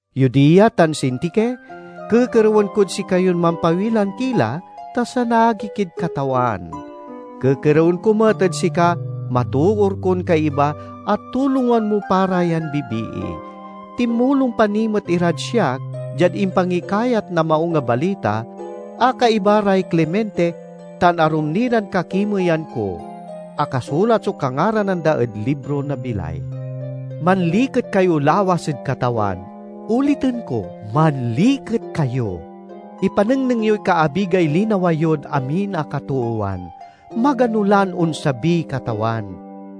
Euodia tan Sintike, kekerewen kod sikayon mampawilan ki la, ta sanagi kid Katawan. Kekerewen ko met ed sika, matoor kon kaiba, a tulongan mo pa ra yan bibii. Tinmulong pa ni met irad siak diad impangikayat na Maung a Balita, a kaiba ray Clemente tan arum ni ran kakimeyan ko. Akasulat so kangaranan da ed libro na bilay. Manliket kayo lawas ed Katawan. Oliten ko: manliket kayo! Ipanengneng yoy kaabigay linawa yod amin a katoowan. Magano lan onsabiy Katawan.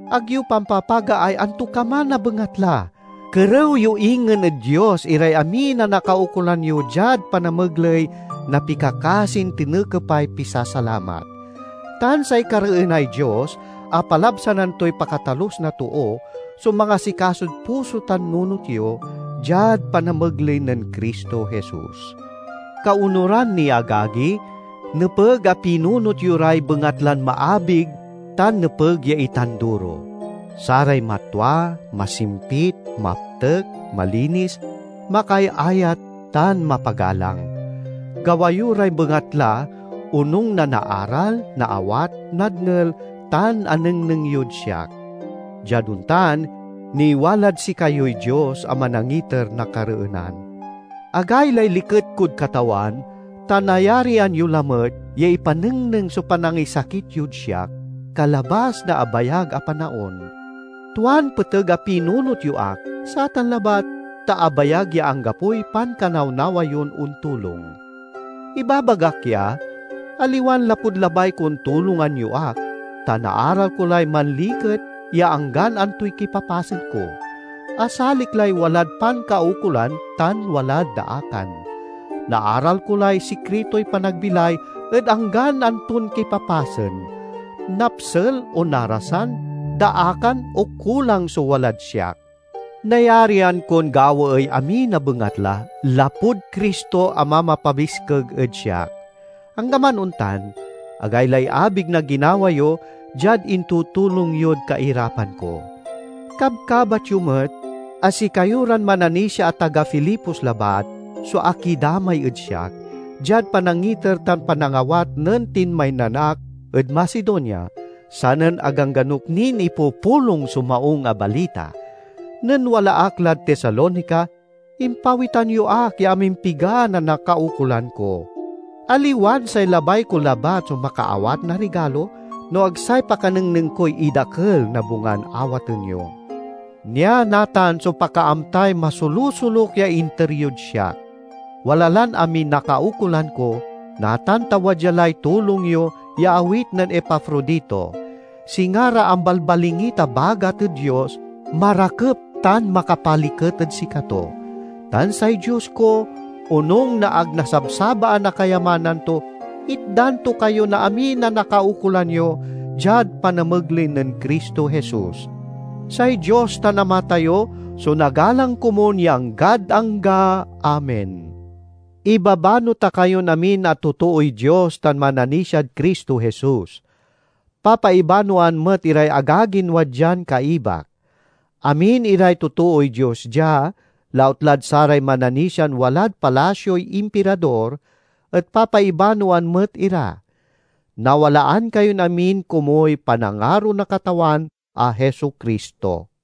Ag yo pampapagaay antokaman a bengatla. Kerew yo ingen ed Dios iray amin a nakaukolan yo diad panamegley na pikakasin tinekepay pisasalamat. Tan say kareenay Dios a palabsanan toy pakatalus na too so mangasikasod puso tan nunot yo, diad panamegley nen Cristo Jesus. Kaonuran ni, agagi, nepeg a pinunot yo ray bengatlan maabig tan nepeg ya itanduro: saray matwa, masimpit, maptek, malinis, makaayayat, tan mapagalang. Gawa yo ray bengatla onung na naaral, naawat, nadngel tan anengneng yod siak. Diad ontan, niwalad sikayoy Dios a manangiter na kareenan. Agaylay liket kod Katawan, ta nayarian yo lamet ya ipanengneng so panangisakit yod siak, kalabas na abayag a panaon. Tuan peteg a pinunot yo ak, satan labat ta abayag ya anggapoy pankanawnawa yon ontulong. Ibabagak ya, aliwan lapud labay kon tulongan yo ak, ta naaral ko lay manliket ya anggan antoy kipapasen ko. Asalik lay walad pankaukolan tan walad daakan. Naaral ko lay sikritoy panagbilay ed anggan anton kipapasen: napsel o narasan, daakan o kulang so walad siak. Nayarian kon gawaey amin a bengatla, lapud Cristo a mamapabiskeg ed siak. Anggaman ontan, agaylay abig na ginawa yo diad intutulong yod kairapan ko. Kabkabat yo met a sikayo ran mananisia a taga Filipos labat so akidamay ed siak, diad panangiter tan panangawat nen tinmaynan ak ed Macedonia, sanen agangganok nin ipupulong so Maung a Balita. Nen wala ak lad Tesalonica, impawitan yo ak ya amimpiga na nakaukolan ko. Aliwan say labay ko labat so makaawat na rigalo, no ag say pakanengneng koy idakel na bungan awaten yo. Nia natan so pakaamtaay masolusoluk ya inter yod siak. Wala lan amiy nakaukolan ko, natan ta wadya lay tulong yo ya awit nen Epafrodito. Singa ra ambalbalingit a bagat ed Dios, marakep tan makapaliket ed sikato. Tan say Dios ko, onung na ag nasabsabaan a kayamanan to, itdan to kayo na amin a nakaukolan yo, diad panamegley nen Cristo Jesus. Say Dios tan Ama tayo so nagalang komun ya anggad angga. Amen. Ibabano ta kayon amin a totooy Dios tan mananisiad Cristo Jesus. Papaibanoan met iray agagin wadyan kaibak. Amin iray totooy Dios dia, lautlad saray mananisian walad palasioy Impirador, et papaibanoan met ira. Nawalaan kayon amin komuy panangaro na Katawan a Jesu-Cristo.